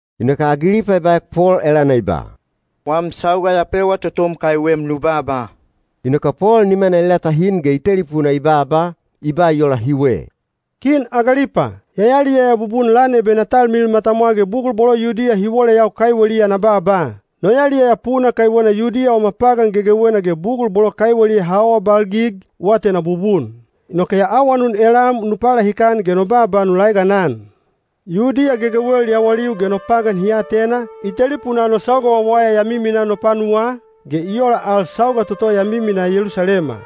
Inoke Agilipa i baek Pol elana i ba, “Wam sauga ya pewa totom kaiwem nu baaba.” Inoke Pol nimana i latahin ge i telipuna i baaba, i ba i ola hiwe. “Kin Agilipa, ya yaliyaya bubun lan ebe na talmilil matamwa ge bugul bolo Yudiya hi woleyau kaiweliya na baaba. No yaliyaya puna kaiwena Yudiya wama pagan gegewena ge bugul bolo kaiweliya ha awabalgig, u atena bubun. Inoke ya awanun elam nu palahikan ge no baaba nu laeganan. Yudiya gegewel yawaliu ge no pagan hi atena, i telipunaa no sauga wawaya ya miminaa no panuwaa, ge i ola al sauga toto ya miminaa Yelusalema.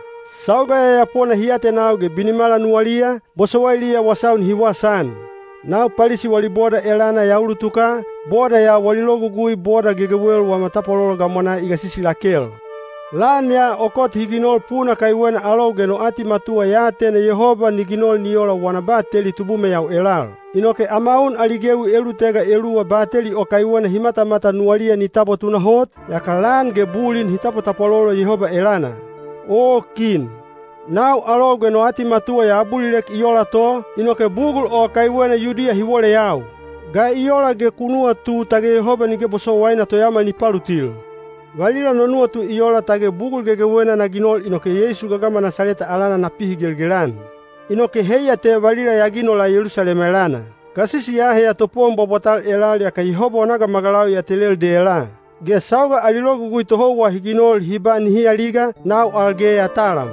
Sauga yayapona hi atenau ge binimala nuwaliya, bosowailiya wasau nihi wasaan. Nau Palisi wali boda elana ya ulutuka, boda ya wali logugui boda gegewel wama tapwalolo gamwanaa i gasisi lakel. Lan ya o kot hi ginol puna kaiwena alou ge no atimatuwa ya atena Yehoba ni ginol ni ola wana bateli tubumeyau elal. Inoke ama un ali gewi elulutega eluwa bateli o kaiwena hi matamatan nuwaliya ni tabwa tunahot, yaka lan ge bulin hi tapwatapwalolo Yehoba elana. Oo kin, nau alou ge no atimatuwa ya abulilek i ola to, inoke bugul o kaiwena Yudiya hi woleyau. Ga i ola ge ku nuwatu tage Yehoba nige bosowaina toyaomal ni palutil? Valila no nuwatu i ola tage bugul gegewena na ginol inoke Yeisu gagama Nasaleta alana na pihigelgel-an. Inoke heiya te valila ya ginola Yelusalema elana. Gasisi ya aheya topowon bwabwatal elal yaka Yehoba wana gamagalau ya telel dela. Ge sauga ali logugui tohouwa hi ginol hi ba nihi aliga, nau al ge ya talam.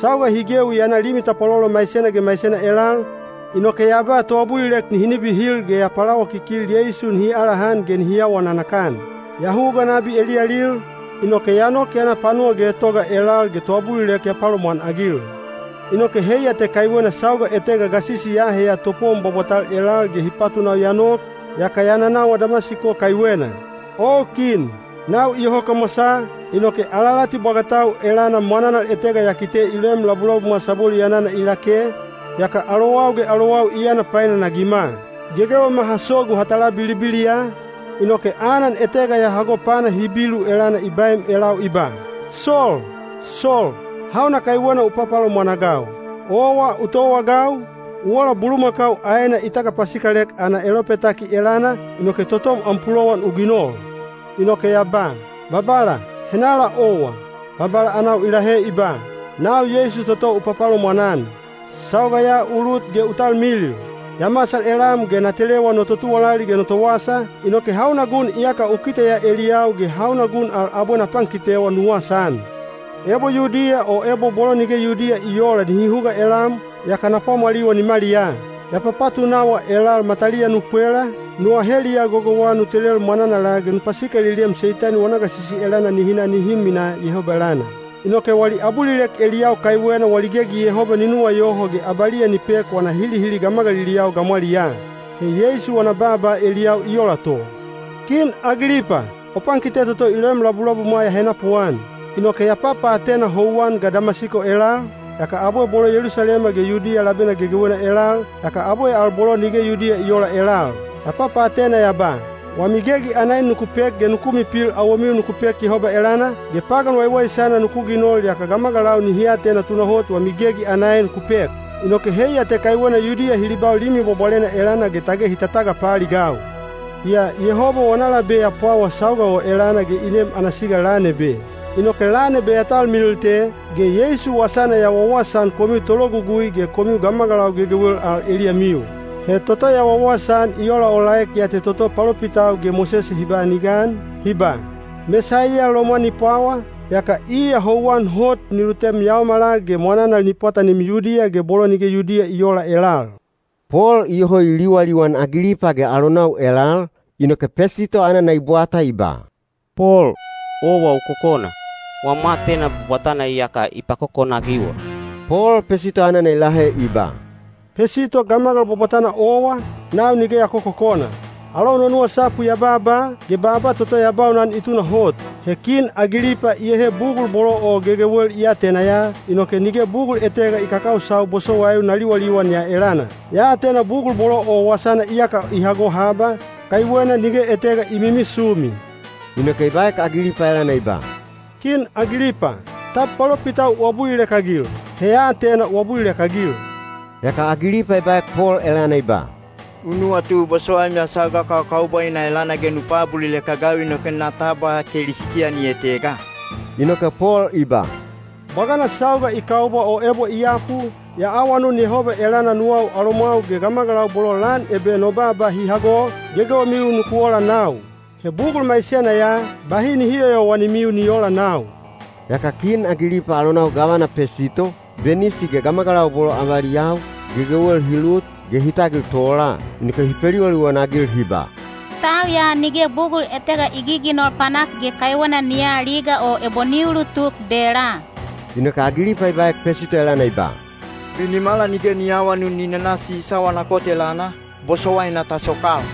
Sauga hi gewi ya na limi tapwalolo maisena ge maisena elal, inoke ya ba toabulilek nihi nibihil ge ya palawakikil Yeisu nihi alahan ge nihi awa nanakan. Ya huga nabi eliyalil, inoke ya nok ya na panuwa getoga elal ge toabulilek ya palomwanagil. Inoke heiya te kaiwena sauga etega gasisi ya aheya topowon bwabwatal elal ge hi patunau ya nok, yaka ya nanawa Damasiko kaiwena. O kin, nau iyoho kamwasaa, inoke alalati bwagatau elana mwananal etega ya kite i loem labulabumwa sabwelu yanana i lake, yaka alowau ge alowau i yana painanagima. Gegewema ha sogu ha tala bilibiliya, inoke anan etega ya hago pana Hibilu elana i baem elau i ba, ‘Sol! Sol! Hauna kaiwena u papalomwan-agau? Owa u towaagau, u ola bulumakau aena i tagapasikalek ana elopetaki elana, inoke totom am pulowan u ginol.’ Inoke ya ba, ‘Babala, henala owa?’ Babala anau i lahe i ba, ‘Nau Yeisu toto u papalomwan-an. Sauga ya u lut ge u talmilil. Ya masal elam ge na telewa no totuwalali ge no towasa, inoke hauna gun iyaka u kiteya eliyau ge hauna gun al abwe na pankitewa nu wasaan. Ebo Yudiya o ebo bolo nige Yudiya i oola nihi huga elam, yaka na pwamwaliwa nimaliyaa. Ya papatunawa elal mataliya nu pwela, nu aheliya gogouwa nu telel mwananala ge nu pasikaliliem Seitani wana gasisi elana nihi na nihi minaa Yehoba elana. Inoke wali abulilek eliyau kaiwena wali gegi Yehoba ni nuwayoho ge abaliya ni pek wana hilihili gamagaliliyau gamwaliyaa.’ He Yeisu wana baaba eliyau i ola to. Kin Agilipa, o pankite toto i loem labulabumwa ya henapuan. Inoke ya papaatena houwan ga Damasiko elal, yaka abwe bolo Yelusalema ge Yudiya labena gegewena elal, yaka abwe al bolo nige Yudiya i oola elal. Ya papaatena ya ba, ‘Wami gegi ana en nuku pek ge nuku mipil awomiu nuku pek Yehoba elana, ge pagan waiwaisana nuku ginol yaka gamagalau nihi atena tunahot wami gegi ana en ku pek.’ Inoke heiya te kaiwena Yudiya hi libau Limi Bwabwalena elana ge tage hi tatagapaaligau. Yaa Yehoba wana labe ya pwawa sauga o elana ge i nem ana siga lan ebe. Inoke lan ebe ya talmilil te, ge Yeisu wasana ya wawasaan komiu tologugui ge komiu gamagalau gegewel al eliyamiu. He toto ya wawasaan i olaolaek ya te toto palopitau ge Mosese hi ba ni gan, hi ba, ‘Mesaiya lomwan ni pwawa, yaka iya houwan hot ni lutem yaomala ge mwananal ni pwatanim Yudiya ge bolo nige Yudiya i oola elal.’” Pol iyoho i liwaliwan Agilipa ge alonau elal, inoke Pesito anana i bwata i ba, “Pol, owa u kokona! Wam aatena bwabwatana iyaka i pakokona-agiwa.” Pol Pesito anana i lahe i ba, “Pesito gamagal bwabwatana owa, nau nige ya kokokona. Alou no nuwasapu ya baaba, ge baaba toto ya baunan i tunahot. He Kin Agilipa iyehe bugul bolo o gegewel i atena ya, inoke nige bugul etega i kakausau bosowaiu na liwaliwan ya elana. Ya atena bugul bolo o wasana iyaka i hago haba, kaiwena nige etega i mimisumi.” Inoke i baek Agilipa elana i ba, “Kin Agilipa, tab palopitau u abulilek-agil? He ya atena u abulilek-agil.” Yaka Agilipa i baek Pol elana i ba, “U nuwatu bosowaim ya sauga kakaubwaina elana ge nu paabulilek-agau inoke na tabwa Kelisitiyani etega?” Inoke Pol i ba, “Bwagana sauga i kaubwa o ebo i yapu, ya awanun Yehoba elana nuwau alomwau ge gamagalau bolo lan ebe no baaba hi hago, gegewemiu nuku ola nau. He bugul maisena ya, bahi nihi yoyowanimiu ni oola nau.” Yaka kin Agilipa alonau gavana Pesito, Benisi ge gamagalau bolo avaliyau, gegewel hi lut, ge hi tagil tola. Inoke hi peliwaliwan-agil hi ba, “Tau ya nige bugul etega i giginol panak ge kaiwena ni aliga o ebo ni ulutuk dela.” Inoke Agilipa i baek Pesito elana i ba, “Binimala nige ni aawanun ni nana Sisa wana kot elana, bosowaina ta sokal.”